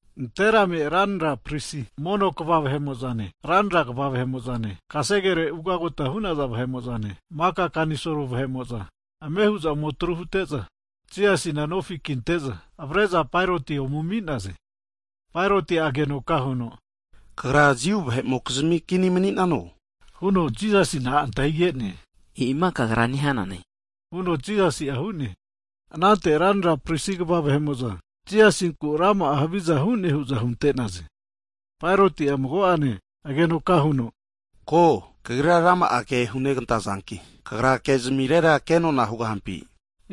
Nanterame ranra prisi mono kva vahe'mo'zane, ranra kva vahe'mo'zane, kasegere ugagota hu'naza vahe'mo'zane, maka kanisol vahe'mo'za, ame hu'za ome atru hute'za, Jisasina nofi kinte'za avre'za Paeroti ome ami'naze. Paeroti'a agenoka huno, Kagra Jiu vahe'mokizmi kini mani'nano? huno Jisasina antahige'ne. E'ima kagra nehanane huno Jisasi'a hu'ne. Anante ranra prisi kva vahe'mo'za, Jisasinku rama'a haviza hu'ne hu'za hunte'naze. Paeroti'a mago'ane agenoka huno ko, Kagrira rama'a ke hunegantazanki, Kagra ke zmirera kenona hugahampi?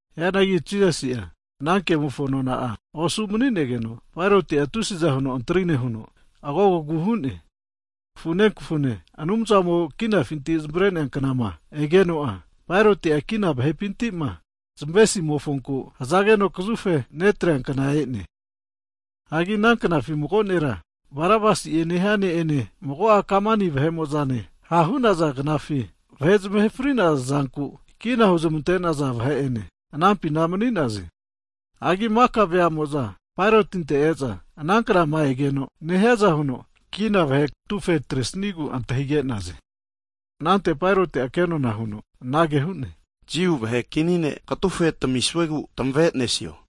Hianagi Jisasi'a ana kemofo nona'a osu mani'negeno, Paeroti'a tusiza huno antri nehuno agogogu hu'ne. Kafune kafune Anumzamo kinafinti zmavre'nea knama egeno'a, Paeroti'a kina vahepintima zmavesimofonku hazageno kazufe netrea kna e'ne. Hagi ana knafi mago nera Barabasi'e nehia ne'ene, mago'a kamani vahe'mozane ha' hu'naza knafi, vahe zmahe frinaza zanku kina huzmante'naza vahe'ene anampina mani'naze. Hagi maka vea'mo'za Paerotinte e'za, ana kna'ma egeno nehiaza huno kina vahe katufe atresnigu antahige'naze. Anante Paeroti'a kenona huno anage hu'ne, Jiu vahe kini ne' katufe tamisuegu tmave'nesio?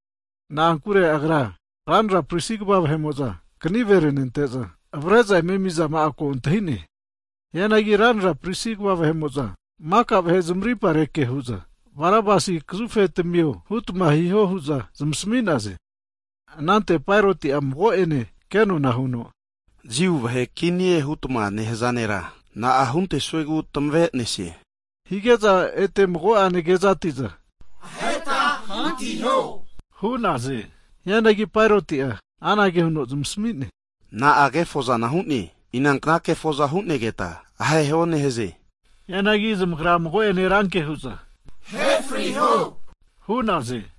Na'ankure agra, ranra prisi kva vahe'mo'za kanive renente'za, avare'za eme ami'zama'a ko antahi'ne. Hianagi ranra prisi kva vahe'mo'za maka vahe zmarimpa rekehu'za, Barabasi kazufe tamiho hutma hiho hu'za zmasami'naze. Anante Paeroti'a mago'ene kenona huno, Jiu vahe kinie hutma nehaza nera, na'a huntesuegu tmave'nesie? Hige'za ete mago'ane kezati'za, aheta kekazafare hantiho hu'naze. Hianagi Paeroti'a anage huno zmasami'ne, na'a kefoza hune, inankna kefoza hu'negeta aheta hantiho nehaze? Hianagi zmagra mago'ene ranke hu'za, ahe friho hu'naze.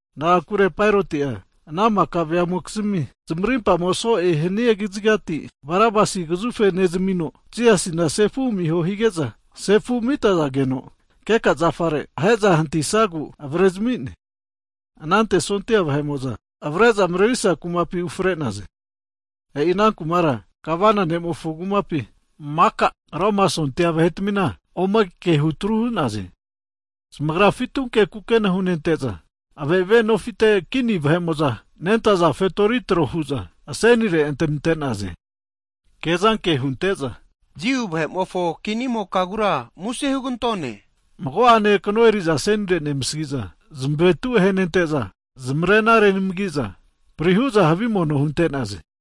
Na'ankure Paeroti'a ana maka vea'mokizmi zmarimpamo so'e hania kazigati, Barabasi kazufe nezamino, Jisasina sefu amiho hige'za, sefu amitazageno keka zafare ahe'za hantisagu avrezmi'ne. Anante sondia vahe'mo'za avare'za mrerisa kumapi ufre'naze. (E'i ana kumara Gavana ne'mofo kumapi) maka Roma sondia vahetamina ome ke hutru hu'naze. Zamagra fitunke kukena hunente'za, ave'ave nofite kini vahe'mokizmi fetorikna huza fetori tro hu'za asenire antaninte'naze. Kezanke hunte'za, Jiu vahe'mofo kinimokagura muse hugantone. Mago'ane kno eriza asenire nemasagi'za, zmavetu ahenente'za, zmarena renamagiza, pri hu'za havi mono hunte'naze.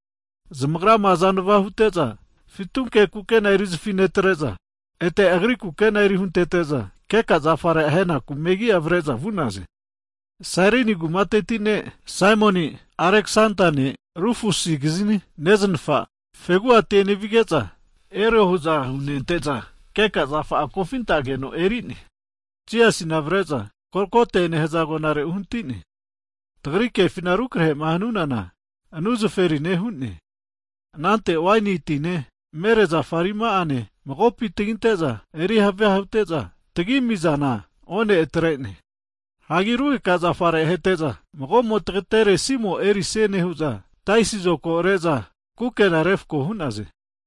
Zamagrama azanava anteteza fitunke kukena erizafi netre'za, ete Agri kukena eri huntete'za, keka zafare aheza hantinaku megi'a avare'za vu'naze. Sairini kumateti ne' Saimoni, (Aleksendane Rufusikizni neznafa) fegu'ati enevige'za, keka zafa'a erio hu'za hunente'za kofintageno eri'ne. Jisasina avare'za Golgote nehaza agonare uhnati'naze. (Tagri kefima rukrahe'ma hanunana, anu zaferine hu'ne.) Anante waini tine mere zafa arima'ane magopi taginte'za eri havia hute'za tagiami'zana, one atre'ne. Hagi rugeka zafare ahete'za, mago'mo tagatere simo erisie nehu'za taisi zokogo re'za kukena'a refko hu'naze.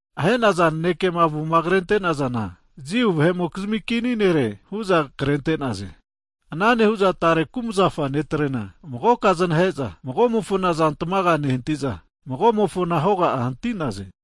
Ahe'naza nanekema avoma krente'nazana, JIU VAHE'MOKIZMI KINI NERE, huza krente'naze. Ana nehu'za tare kumzafa netrena magoka znahe'za, magomofona azantmaga'a nehantiza, magomofona hoga'a hanti'naze.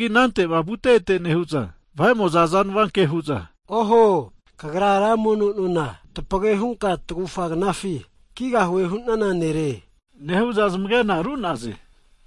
Hagi anante'ma vute ete nehu'za vahe'mo'za azanva ke hu'za, Oho! Kagra ra mono nona tapage hunka tagufa knafi kigahue hu'nana nere, nehu'za zmage'na ru'naze.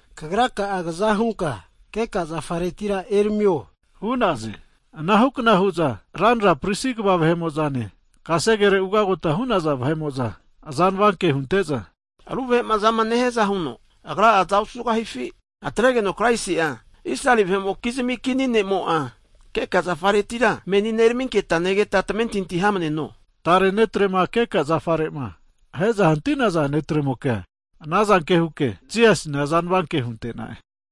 Kagra ka'a kaza hunka keka zafaretira eramio, hu'naze! Anahukna hu'za ranra prisi kva vahe'mo'zane kasegere ugagota hu'naza vahe'mo'za, azanva ke hunte'za, ru vahe azama nehiaza huno Agra'a aza osugahifi? Atregeno Kraisi'a Israeli vahe'mokizmi kini ne'mo'a, keka zafaretira menina eraminketa negeta, tamentinti hamaneno! Tare ne'trema keka zafare'ma ahe'za hanti'naza ne'tremokea, anazanke huke Jisasina azanava ke hunte'na'e.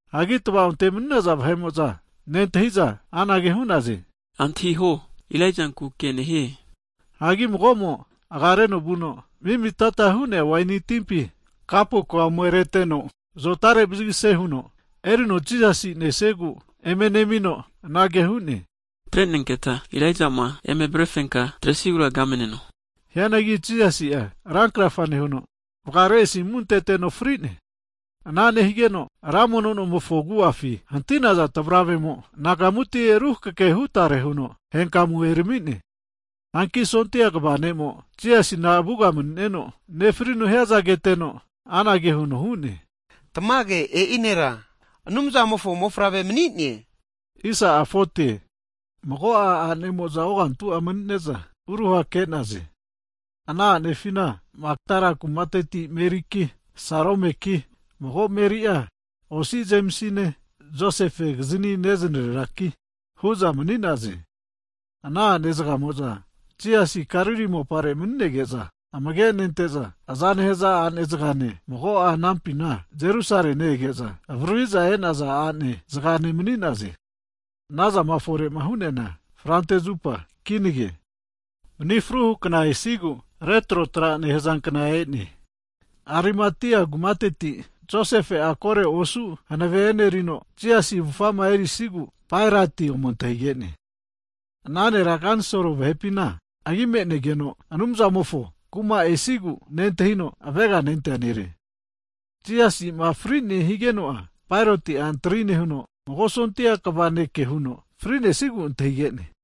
Hanki tva'onte mani'naza vahe'mo'za nentahi'za, anage hu'naze, antahiho, Ilaijanku ke nehie hu'za hu'naze. Hagi mago'mo aga reno vuno mi'mi'tata hu'nea waini timpi kapukua ome reteno, zotare vazigase huno erino Jisasi nesigu eme nemino anage hu'ne, atrenenketa Ilaijama eme avarefenka atresigura kamneno! Hianagi Jisasi'a ran krafa nehuno, vgare asimu anteteno fri'ne. Ana nehigeno ra mono nomofo agu'afi hanti'naza tvaravemo, anagamuti ruhakeke hutare huno henkamu erami'ne. Hanki 100teti'a sondia vahete kva (centurian) ne'mo Jisasina avuga mani'neno nefrino hiazana keteno, anage huno hu'ne. Tmage e'i nera Anumzamofo Mofavre mani'ne huno hu'ne! Mago'a anemo'za ogantu'a mani'ne'za uruha ke'naze. Ana a'nefina, Makdala kumateti Meriki, Saromeki mago Meri'a (osi Jemisine, Josefekizni neznareraki) hu'za mani'naze. Ana a'ne zgamo'za Jisasi Galili mopare mani'nege'za amage nente'za aza nehaza ane zgane, mago'a anampina Jerusale ne-ege'za avaririza e'naza ane zgane mani'naze. Anazama fore hu'neana Frante zupa kinage. Mni fru hukna esigu (Sabat) retro tra nehaza kna e'ne. Arimatia kumateti Josefe'a koro osu hanave enerino, Jisasi avufa'ama erisigu Paeroti ome antahige'ne. (Ana nera kanisol vahepina agi me'negeno, Anumzamofo Kuma esigu nentahino aveganentea nere.) Jisasima frine higeno'a, Paeroti antri nehuno, 100teti'a sondia vahete kva (centurian) ne' ke huno frinesigu antahige'ne.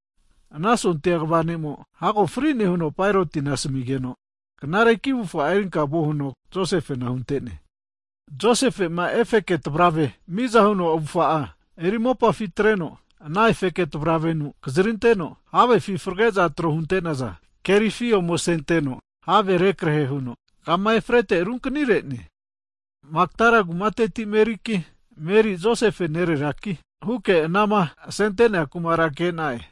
Ana sondia kva ne'mo hago fri'ne huno Paerotina asmigeno, knareki avufga erinka vuo huno Josefena hunte'ne. Josefe'ma efeke tavrave miza huno avufa'a eri mopafi atreno, ana efeke tavravenu kazrinteno, havefi frage'za tro hunte'naza kerifi ome asenteno, have rekrehe huno kama efrete runkni re'ne. Makdala kumateti Meriki, Meri Josefe nereraki huke anama asentea kumara ke'na'e.